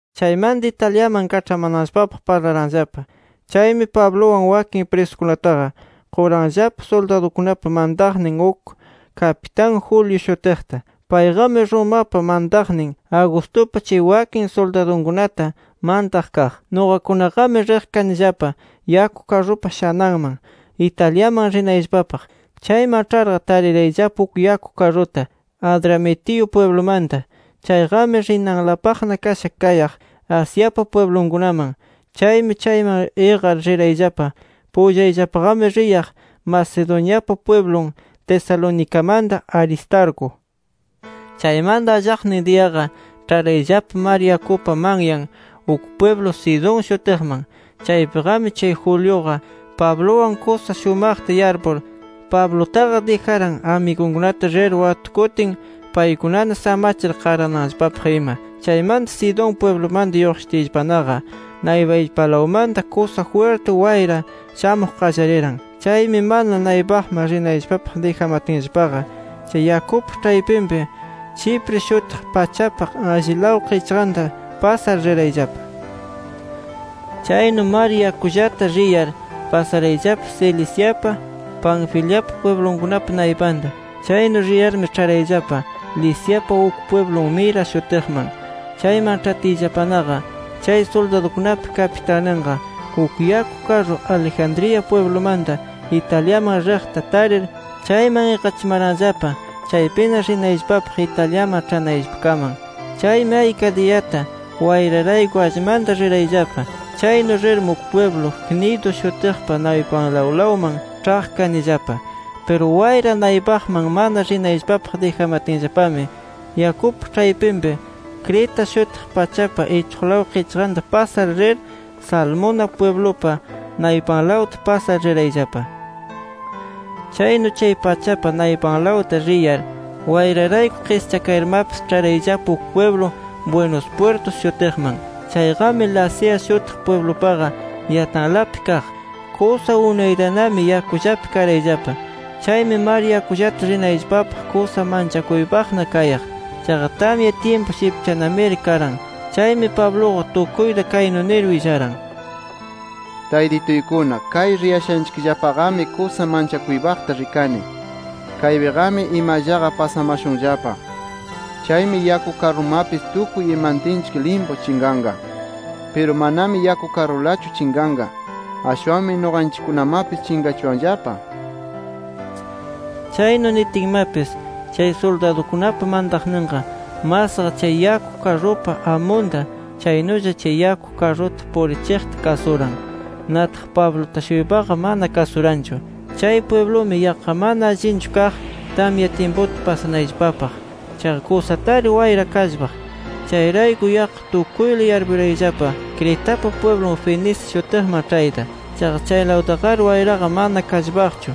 Chaymanta, Italiaman kaĉhamananllapapaq parlaranllapa. Chaymi Pabluwan wakin prisukunataqa quranllapa suldadukunapa mantaqnin uk kapitan Julio shutiqta. Payqami Romapa mantaqnin Augustupa chay wakin suldadunkunata mantaq kaq. Nuqakunaqami riq kanillapa yaku karrupa shananman, Italiaman rinayllapapaq. Chayman ĉharqa tarirayllapa uk yaku karruta Adramitio pwiblumanta. Chayqami rinanlapaqna kasha kayaq Asiapa pwiblunkunaman. Chaymi chayman iqar rirayllapa. Pullayllapaqami riyaq Macedoniapa pwiblun Tesalonicamanta Aristarco. Chaymanta allaqnin diyaqa ĉharayllapa mar yakupa manyan uk pwiblu Sidón shutiqman. Chaypiqami chay Juliuqa, Pabluwan kusa shumaqta yarpur Pablutaqa dijaran amigunkunata rir watukutin, paykunana samachir qarananllapapaq ima. Chaymanta Sidón pwiblumanta lluqshitiyllapanaqa, naypayllapalawmanta kusa jwirti wayra shamuq qallariran. Chaymi mana naypaqman rinayllapapaq dijamatinllapaqa, chay yakupa ĉhaypinpi Chipre shutiq pachapa allilaw qichqanta pasar rirayllapa. Chaynu mar yakullata riyar, pasarayllapa Ciliciapa, Panfiliapa pwiblunkunapa naypanta. Chaynu riyarmi ĉharayllapa Liciapa uk pwiblun Mira shutiqman. Chayman ĉhatiyllapanaqa, chay suldadukunapa kapitanninqa, uk yaku karru Alejandría pwiblumanta Italiaman riqta tarir chayman iqachimaranllapa chaypina rinayllapapaq Italiaman ĉhanayllapakaman. Chaymi ayka diyata wayrarayku allmanta rirayllapa. Chaynu rirmi uk pwiblu Gnido shutiqpa naypanlawlaman ĉhaq kanillapa. Piru wayra naypaqman mana rinayllapapaq dijamatinllapami, yakupa ĉhaypinpi Creta shutiq pachapa ichuqlaw qichqanta pasar rir, Salmona pwiblupa naypanlawta pasar rirayllapa. Chaynu chay pachapa naypanlawta riyar wayrarayku qischakayarmapis ĉharayllapa uk pwiblu “Buenos Puertos” shutiqman. Chayqami Lasea shutiq pwiblupaqa yatalanpi kaq. Kusa unaytanami yakullapi karayllapa. Chaymi mar yakullata rinayllapapaq kusa manchakuypaqna kayaq. Chaqa tamya tyimpu shipchanamiri karan. Chaymi Pabluqa tukuyta kaynu nir willaran: —Taytituykuna kay riyashanchikllapaqami kusa manchakuypaqta rikani. Kaypiqami imallaqa pasamashunllapa. Chaymi yaku karrumapis tukuy imantinchik limpu chinqanqa. Piru manami yaku karrulachu chinqanqa, ashwanmi nuqanchikkunamapis chinqachuwanllapa nir. Chaynu nitinmapis, chay suldadukunapa mantaqninqa, masqa chay yaku karrupa amunta, chaynulla chay yaku karruta purichiqta kasuran. Nataq Pabluta-shuypaqa mana kasuranchu. Chay pwiblumi yaqqa mana allinchu kaq tamya tyimputa pasanayllapapaq. Chaqa kusatari wayra kallpaq. Chayrayku yaqqa tukuyla yarpurayllapa Cretapa pwiblun Fenice shutiqman ĉhayta. Chaqa chaylawtaqari wayraqa mana kallpaqchu.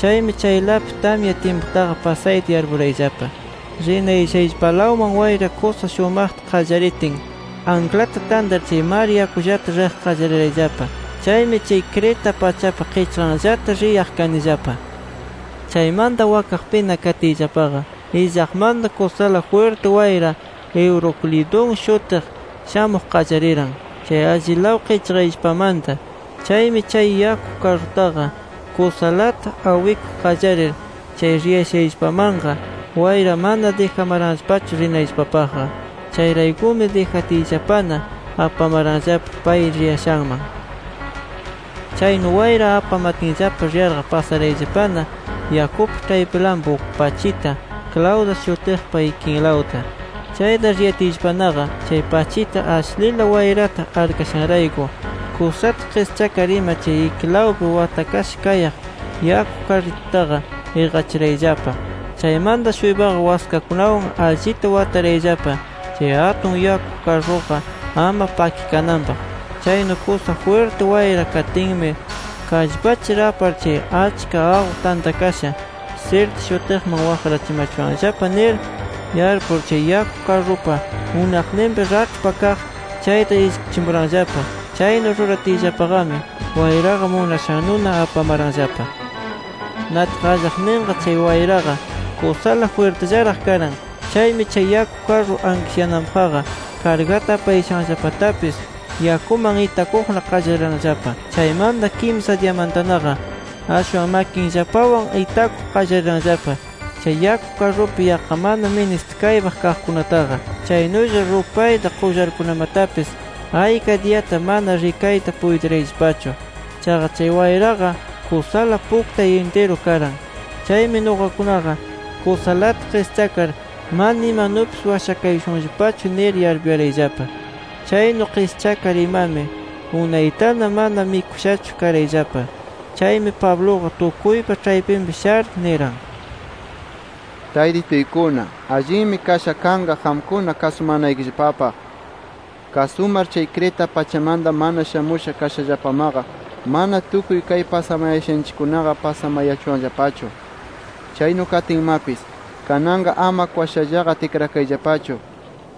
Chaymi chaylapi tamya tyimputaqa pasayta yarpurayllapa. Rinayashayllapalawman wayra kusa shumaqta qallaritin, anklata tantar chay mar yakullata riq qallarirayllapa. Chaymi chay Creta pachapa qichqanllata riyaq kanillapa. Chaymanta wakaqpina katiyllapaqa illaqmanta kusala jwirti wayra Euroclidón shutiq shamuq qallariran chay allilaw qichqayllapamanta. Chaymi chay yaku karrutaqa kusalata awikuq qallarir, chay riyashayllapamanqa wayra mana dijamaranllapachu rinayllapapaqqa. Chayraykumi dijatiyllapana apamaranllapa pay riyashanman. Chaynu wayra apamatinllapa riyarqa pasayarayllapana yakupa ĉhaypilanpi uk pachita Clauda shutiqpa ikinlawta. Chayta riyatiyllapanaqa chay pachita ashlila wayrata arkashanrayku, kusata qischakar ima chay ikilawpi watakasha kayaq yaku karritutaqa iqachirayllapa. Chaymanta-shuypaqa waskakunawan allita watarayllapa chay atun yaku karruqa ama pakikananpaq. Chaynu kusa jwirti wayra katinmi, kallpachir apar chay achka aqu tantakasha Sirte shutiqman waqrachimachuwanllapa nir yarpur, chay yaku karrupa unaqninpi raĉhpa kaq chayta ishkichimuranllapa. Chaynu ruratiyllapaqami wayraqa munashannuna apamaranllapa. Nataq allaqninqa, chay wayraqa kusala jwirtillaraq karan. Chaymi chay yaku karru ankishyananpaqqa, kargata apayashanllapatapis yakuman itakuqna qallariranllapa. Chaymanta kimsa diyamantanaqa, ashwan makinllapawan itakuq qallariranllapa chay yaku karrupi yaqqa mana ministikaypaq kaqkunataqa. Chaynulla rupayta, qullarkunamatapis ayka diyata mana rikayta puytirayllapachu. Chaqa, chay wayraqa kusala puktay intiru karan. Chaymi nuqakunaqa kusalata qischakar mana imanupis washakayashunllapachu nir yarpuyarayllapa. Chaynu qischakar imami, unaytana mana mikushachu karayllapa. Chaymi Pabluqa tukuypa ĉhaypinpi shar niran: —Taytituykuna, allinmi kasha kanqa qamkuna kasumanaykillapapaq. Kasumar chay Creta pachamanta mana shamusha kashallapamaqa, mana tukuy kay pasamayashanchikkunaqa pasamayachuwanllapachu. Chaynu katinmapis, kananqa ama kwashallaqa tikrakayllapachu.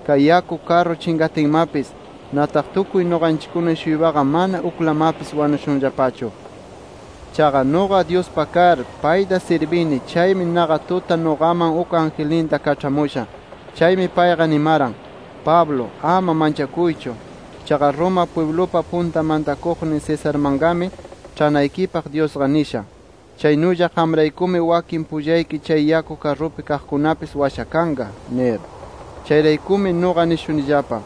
Kay yaku karru chinqatinmapis, nataq tukuy nuqanchikkuna-shuypaqa mana uklamapis wanushunllapachu. Chaqa nuqa Dyuspa kar, payta sirbini chaymi naqa tuta nuqaman uk angelninta kaĉhamusha. Chaymi payqa nimaran: ‘Pablo, ama manchakuychu. Chaqa Roma pwiblupa punta mantakuqnin Cesarmanqami ĉhanaykipaq Dyusqa nisha. Chaynulla qamraykumi wakin pullayki chay yaku karrupi kaqkunapis washakanqa’ nir. Chayraykumi nuqa nishunillapa: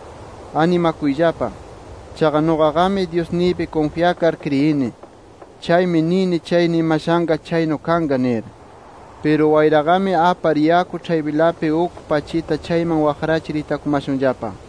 Animakuyllapa. Chaqa nuqaqami Dyusniypi kunfyakar kriyini. Chaymi nini chay nimashanqa chaynu kanqa nir. Piru wayraqami apar yaku ĉhaypinlapi uk pachita chayman waqrachir itakumashunllapa.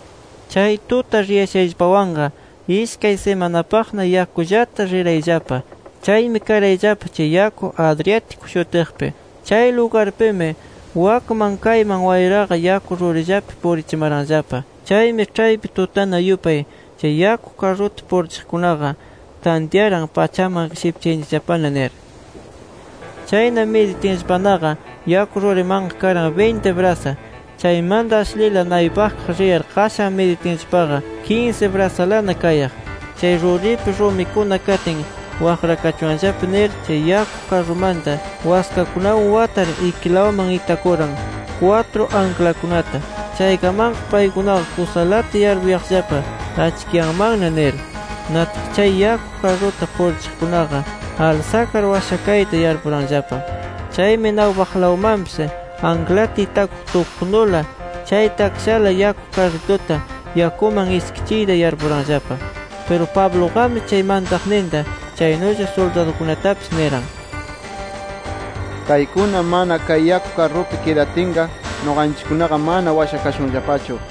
Chay tuta riyashayllapawanqa ishkay simanapaqna yakullata rirayllapa. Chaymi karayllapa chay yaku Adriático shutiqpi. Chay lugarpimi wakman kayman wayraqa yaku rurillapi purichimaranllapa. Chaymi ĉhaypi tutana yupay chay yaku karruta purichiqkunaqa tantyaran pachaman shipchayanchikllapana nir. Chayna miditinllapanaqa yaku rurimanqa karan binti brasa. Chaymanta ashlila naypakaq riyar qashan miditinllapaqa kinsi brasalana kayaq. Chay ruripi rumikuna katin waqrakachuwanllapa nir, chay yaku karrumanta waskakunawan watar ikilawman itakuran kwatru anklakunata. Chaykamanqa paykunaqa kusalata yarpuyaqllapa achkiyanmanna nir. Nataq chay yaku karruta purichiqkunaqa alsakar washakayta yarpuranllapa. Chaymi naypaqlawmanpis anklata itakuq tukuqnula chay takshala yaku karrituta yakuman ishkichiyta yarpuranllapa. Piru Pabluqami, chay mantaqninta chaynulla suldadunkunatapis niran: —Kaykuna mana kay yaku karrupi kidatinqa, nuqanchikkunaqa mana washakashunllapachu nir.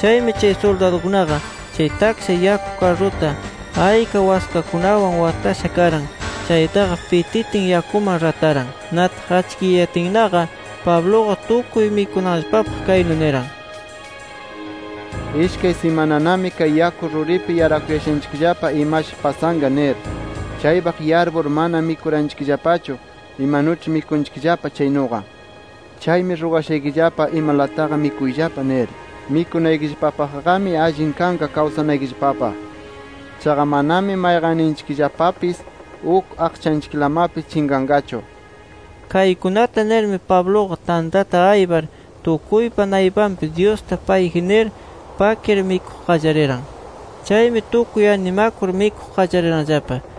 Chaymi chay suldadukunaqa, chay taksha yaku karruta ayka waskakunawan watasha karan chaytaqa pititin, yakuman rataran. Nataq achkiyayatinnaqa, Pabluqa tukuy mikunanllapapaq kaynu niran: —Ishkay simananami kay yaku ruripi yarakushanchikllapa imashi pasanqa nir. Chaypaq yarpur mana mikuranchikllapachu imanuĉhi mikunchikllapa chaynuqa. Chaymi rugashaykillapa imalataqa mikuyllapa nir. Mikunaykillapapaqmi allin kanqa kawsanaykillapapaq. Chaqa manami mayqanninchikllapapis uk aqchanchiklamapis chinqanqachu nir. Kaykunata nirmi Pabluqa tantata aypar tukuypa naypanpi Dyusta payji nir, pakir mikuq qallariran. Chaymi, tukuy animakur mikuq qallariranllapa.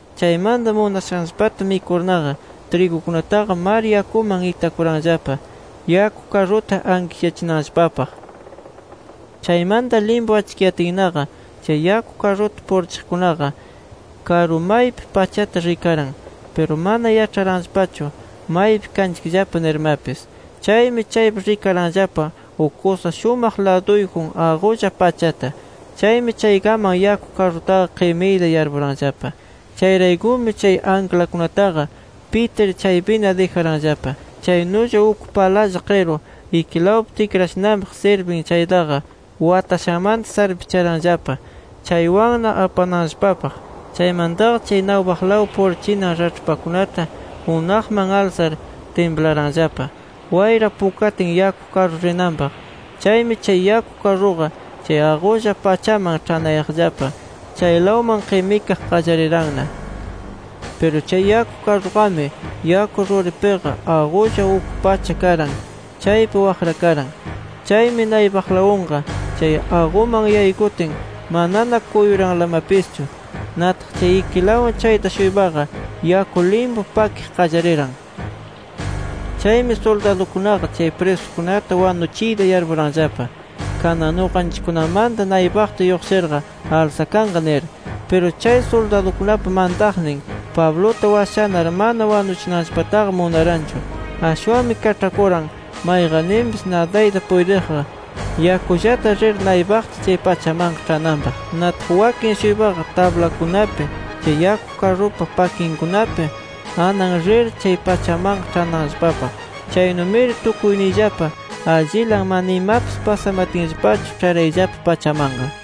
Chaymanta munashanllapata mikurnaqa, trigukunataqa mar yakuman itakuranllapa, yaku karruta ankishyachinanllapapaq. Chaymanta limpu achkiyatinnaqa, chay yaku karruta purichiqkunaqa karu maypi pachata rikaran. Piru mana yaĉharanllapachu maypi kanchikllapa nirmapis. Chaymi chaypi rikaranllapa uk kusa shumaq laduyjun aqulla pachata. Chaymi chaykaman yaku karrutaqa qimiyta yarpuranllapa. Chayraykumi chay anklakunataqa, pitir chaypina dijaranllapa. Chaynulla uk palalla qiru ikilawpi tikrachinanpaq sirbin chaytaqa, watashanmanta sarpicharanllapa chaywanna apananllapapaq. Chaymantaqa chay naypaqlaw purichinan raĉhpakunata unaqman alsar timplaranllapa, wayra pukatin yaku karru rinanpaq. Chaymi chay yaku karruqa chay aqulla pachaman ĉhanayaqllapa chaylawman qimikaq qallariranna. Piru chay yaku karruqami, yaku ruripiqa aqulla uk pacha karan chaypi waqrakaran. Chaymi naypaqlawunqa chay aquman yaykutin, manana kuyuranlamapischu. Nataq chay ikilawun chayta-shuypaqa yaku limpu pakiq qallariran. Chaymi suldadukunaqa, chay prisukunata wanuchiyta yarpuranllapa kanan nuqanchikkunamanta naypaqta lluqshirqa alsakanqa nir. Piru, chay suldadukunapa mantaqnin, Pabluta washanar mana wanuchinanllapataqa munaranchu. Ashwanmi kaĉhakuran, mayqanninpis nadayta puytiqqa yakullata rir naypaqta chay pachamanqa ĉhananpaq. Nataq wakin-shuypaqa tablakunapi, chay yaku karrupa pakinkunapi anan rir chay pachamanqa ĉhananllapapaq. Chaynumiri tukuyniyllapa allilan mana imapis pasamatinllapachu, ĉharayllapa pachamanqa.